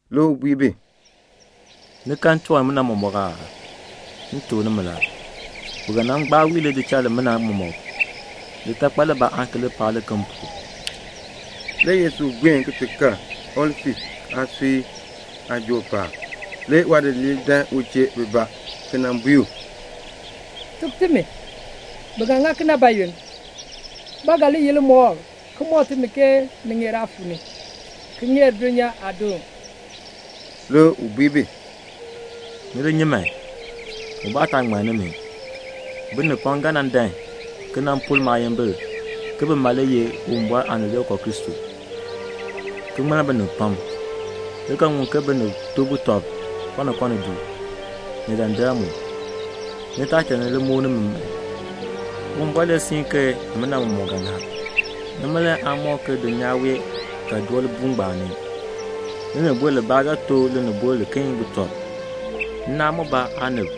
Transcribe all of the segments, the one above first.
Le u bui bi, "Ni kan tiwan nimina mɔmɔk aa? M tuk nimi la, bi ga nan gbaa wii lidichal limina mɔmɔk. Litakpal libaa aan ki li paa liken pu." Le u buen ti kal Olif aasui aajool paab. Le waadidiliib dan u chee bibaa, ki nan bui u, "Tuk timi, bi ga ŋa kena bayoonn? Ba ga li ye limɔkl ki mɔk timi ke ni ŋeer aa fuu ni, ki ŋeer dulnyaa aadoon?" Le u bui bi, "Ni li nyi man, ubaa taa ŋmann nimi. Binib pam le ga nan dan ki pur maayimbil ke bima le ye Uwumbɔr Aanileekoo Kristo, ki ŋmann binib pam. Ni ga ŋun ke binib to butɔb kɔnkɔni du, ni dandar mu. Ni taa cha ni li muk nimi man. Uwumbɔr le siin ke nimina mɔmɔk ga ŋa. Nima le aan mɔk ke dulnyaa wee ga doo libuul ngbaan ni. Linibol libaa ga to linibol liken butɔb. Nnaan mubaa aanib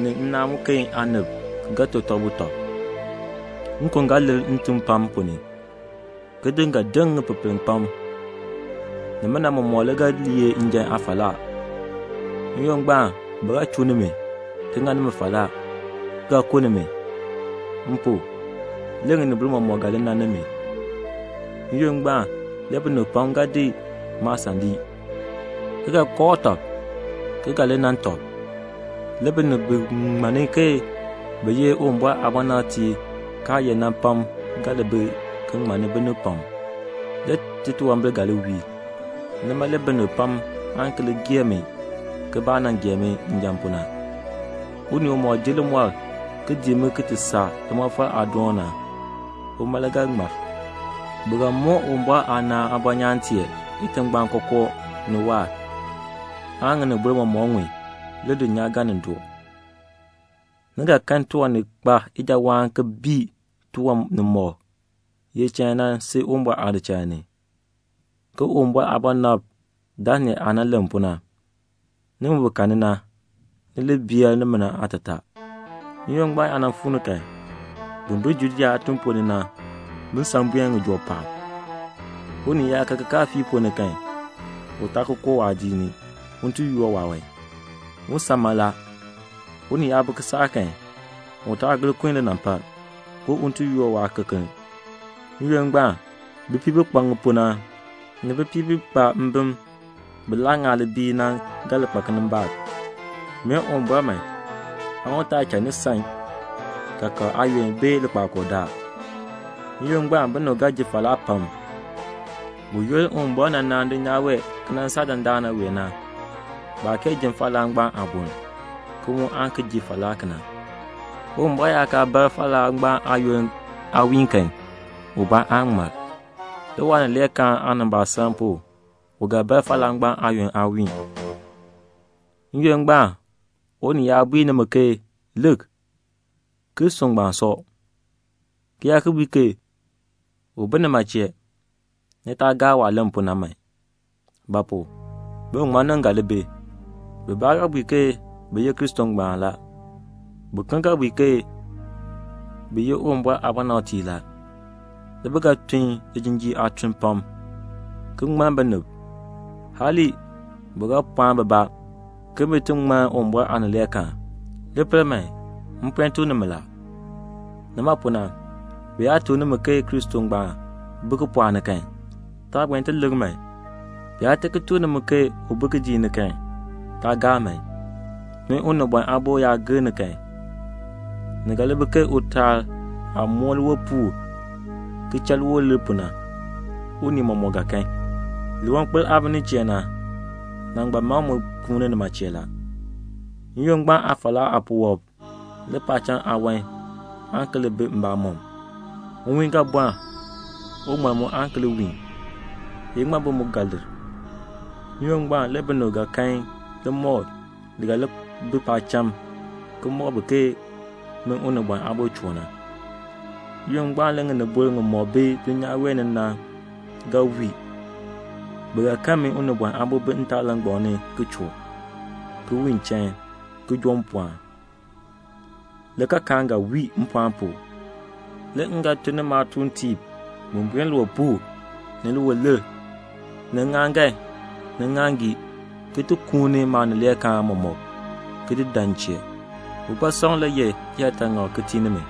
ni nnaan muken aanib ga to tɔb butɔb. Nkon le ga lir ntim pam ponn ni. Kitiŋ ga deŋ ŋipepel pam. Nimina mɔmɔk le ga li ye njan aafalaa. "N-yoonn ngbaan bi ga chuu nimi, ki ŋa nimi falaa, ki ga ku nimi. M pu, le ŋinibol mɔmɔk ga li nan nimi. N-yoonn ngbaan le binib pam ga di maasan ki di lii, ki ga kooh tɔb, ki ga li nan tɔb. Le binib pam bi ŋmann ke bi ye Uwumbɔr aabɔnabtiib kaa ye na, ga li bi ki ŋmanni binib pam. Le titunwambir ga li wiir. Nima le binib pam aan ki li gee mi ke baah nan gee mi njan pu na. Unii umɔk ji limɔr ki dii mi ki ti saa limɔfal aadoon na, uma le ga ŋmar. Bi ga moon Uwumbɔr aanaan aabɔnyaan tee itingbaan kookoo ni waahr, aan ŋinibol mɔmɔk ŋun, le dulnyaa ga nin doo." "Ni ga kan tiwan ni kpa ijawaan ki bii tiwan nimɔk ye chain na si Uwumbɔr aadichal ni, ke Uwumbɔr aabɔnabr Daniel aah nan len pu na." (Nimi bi karni na, ni li bee nimina aatataa.) "N-yoonn ngbaan yaa nan fuu ni kan, bin bi Judea aatiŋ ponn ni na, bin san buen ŋijoo paab. Unii yaa ka kikaafiik ponn ni kan, u taa ki koo waadiik ni un ti yoor waawan. Un san mala. Unii yaa bi kisaak kan, u taa gir kun linampal, ke un ti yoor waakekeln. N-yoonn ngbaan, bipiib bi kpa ŋipuu na, ni bipiib bi kpa mbim bi ŋaa libiil na, bi ga li kpa kinimbaak. Mee Uwumbɔr man, u taa cha ni san kaakab aayoonn bee likpakool daal. N-yoonn ngbaan binib ga ji falaa pam. Buyoonn Uwumbɔr nan naan dulnyaa wee ki nan saa dandana wee na, baa kee ji falaa ngbaan aaboln, ki mu aan ki ji falaa kena. Uwumbɔr yaa kaa bar falaa ngbaan aayoonn aawiin kan, ubaa aan ŋmar. Le waanileekaan aanimbaasaln pu u ga bar falaa ngbaan aayoonn aawiin. "N-yoonn ngbaan unii yaa bui nimi ke 'Lik, Kristo ngbaan sɔ,' ki yaa ki bui ke 'U bi nima chee', ni taa gaa waah len pu na man. Ba pu? biŋmaŋmannim ga li bi. Bibaa ga bui ke bi ye Kristo ngbaan la. Biken ga bui ke bi ye Uwumbɔr aabɔnabtiib la. Le bi ga tun lijinjiir aatun pam, ki ŋmann binib. Hali, bi ga pɔɔn bibaa ke bin ti ŋmann Uwumbɔr aanileekaan. Li pel man, m puen tuk nimi la. "Nima pu na, bi yaa tuk nimi ke Kristo ngbaan bi kipɔɔk ni kan, taa buen ti lik man. Bi yaa ti ki tuk nimi ke u bi kidiik ni kan, taa gaa man. Min Unibɔn Aabo yaa gir ni kan, ni ga li bi ke utaal aah moo liwipuul ki cha liwilir pu na, unii mɔmɔk ga kan. "Liwankpol aah bi nin chee na, nangbal mam mu kuuni nima chee la." "N-yoonn ngbaan aafalaa aapuwɔb, le paacham aawan aan ki li bi mbamɔm. Nwiin le ga bɔln. Uŋmal mu aan ki li wiin. Iŋmabi mu ga lir. N-yoonn ngbaan le binib ga kan limɔkl li ga li bi paacham ki mɔk bi ke min Unibɔn Aabo choo na. N-yoonn ngbaan le ŋinibol ŋimɔk bi dulnyaa wee ni na ga wii. Bi ga kan min Unibɔn Aabo bi ntaalangbam ni ki choo, ki wiin chain, ki joo mpɔɔn. Le kaakaan ga wii mpɔɔn pu. Le m ga tun ni maatuuntiib bin buen liwipuul, ni liwilir, ni ŋŋaaŋgan, ni ŋŋaaŋgii, bin ti kuuni maanileekaan mɔmɔk, ki di dan m chee." "Bikpasɔm le ye liyaataŋakl ki tii nimi.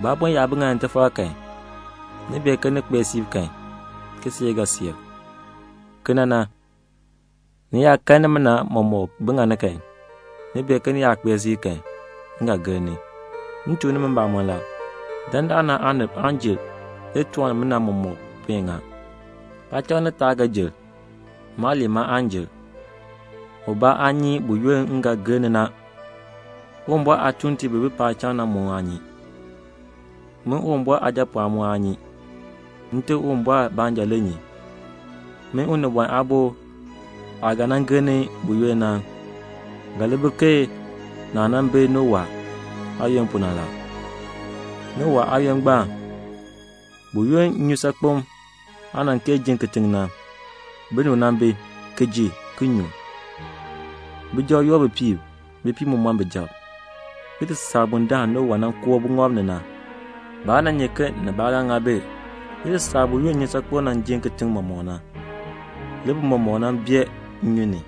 Bu aabon yaa bi ŋani tifar kan, ni bee ke ni kpee siib na kan, kiseek ga seer. Kena na, ni yaa kan nimina mɔmɔk bi ŋani kan, ni bee ke ni kpee siib na kan, m ga gir ni. M tuk nimi mbamɔn la, dandana aanib aan jer le tiwan nimina mɔmɔk puen ŋa. Paacham ni taab le ga jer. Maaliin ma aan jer." "Ubaa aa nyi buyoonn m ga gir ni na. Uwumbɔr aatuuntiib bi bi paacham na aa nyi. Min Uwumbɔr Aajapɔɔn mu aa nyi. Nte Uwumbɔr baanja le nyi. Min Unibɔn Aabo aah ga nan gir ni buyoonn na, ga li bi ke naah nan bi Nowa aayoonn pu na. Nowa aayoonn ngbaan, buyoonn nnyusaakpem aa kee jin kitiŋ na, binib nan bi, ki ji, ki nyu, bijab yoor bipiib, bipiib mu mɔn bijab, ki ti saa bundaln Nowa nan koo buŋɔb ni na. Baa nyi ke nibaa ga ŋa bi, ki ti saa buyoonn nnyusaakpem nan jin kitiŋ mɔmɔk na. Le bi mɔmɔk nan bee nnyun ni.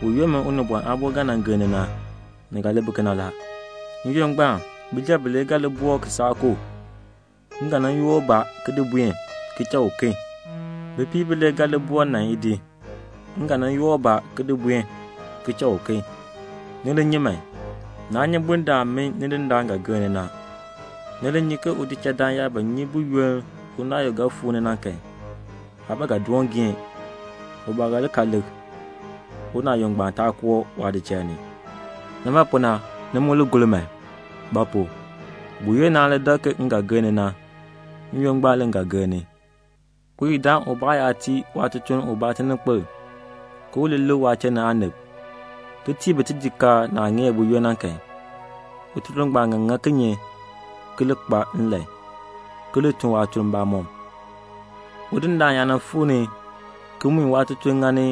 Buyoonn min Unibɔn Aabo ga nan gir ni na, ni ga li bi kena la. N-yoonn ngbaan bijab bilee ga li bi boo kisaak ko. M ga nan yoor ubaa ki di buen, ki cha uken. Bipiib bilee ga li boo nan idi. M ga nan yoor ubaa ki di buen, ki cha uken. Ni li nyi man. Naa nyi bundaln min Nidindaan ga gir ni na. Ni bee ke udichaldaan yaa ba nyi buyoonn unaayuk ga fuu ni na kan, waa ba ga doon geen. U ba ga li ka lik, unaayuk ngbaan taa koo waadichal ni. Nima pu na, ni mu li gor man; ba pu? buyoonn naan li dak ke m ga gir ni na, n-yoonn ngbaan le m ga gir ni." "Uyidaan ubaa yaa tii waatutuln ubaa tininkpil ke u li lik waachiln ni aanib ki tii bi tijikaar naah ŋeer buyoonn na kan, ututuln ngbaan ga ŋa kinye ki li kpa nlan, ki li tun waatuln mbamɔm? Udindaan yaa fuu ni ki mui waatutuln ŋani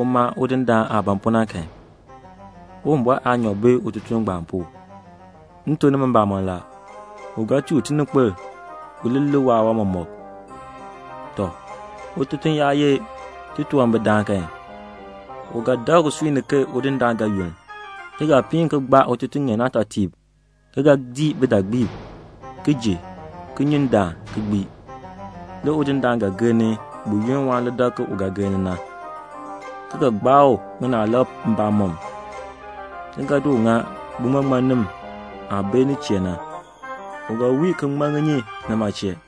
uma udindaan aah ban pu na kan, Uwumbɔr aanyoor bi ututuln ngbaan pu. M tuk nimi mbamɔn la, u ga tii u tininkpil u li lik waawan mɔmɔk. Tɔ, ututuln yaa ye titunwambirdaan kan, u ga dak usui ni ke udindaan ga yunn, ki ga piin ki gbaa ututuŋeen aatɔtiib, ki ga dii bidaagbiib, ki ji, ki nyu ndaan ki gbii. Le udindaan ga gir ni buyoonn waan li dak ke u ga gir ni na, ki ga gbaa u ŋinaalab mbamɔm, ki ga di u ŋa biŋmaŋmannim aah bi nin chee na. U ga wii ki ŋman ŋinyin nima chee."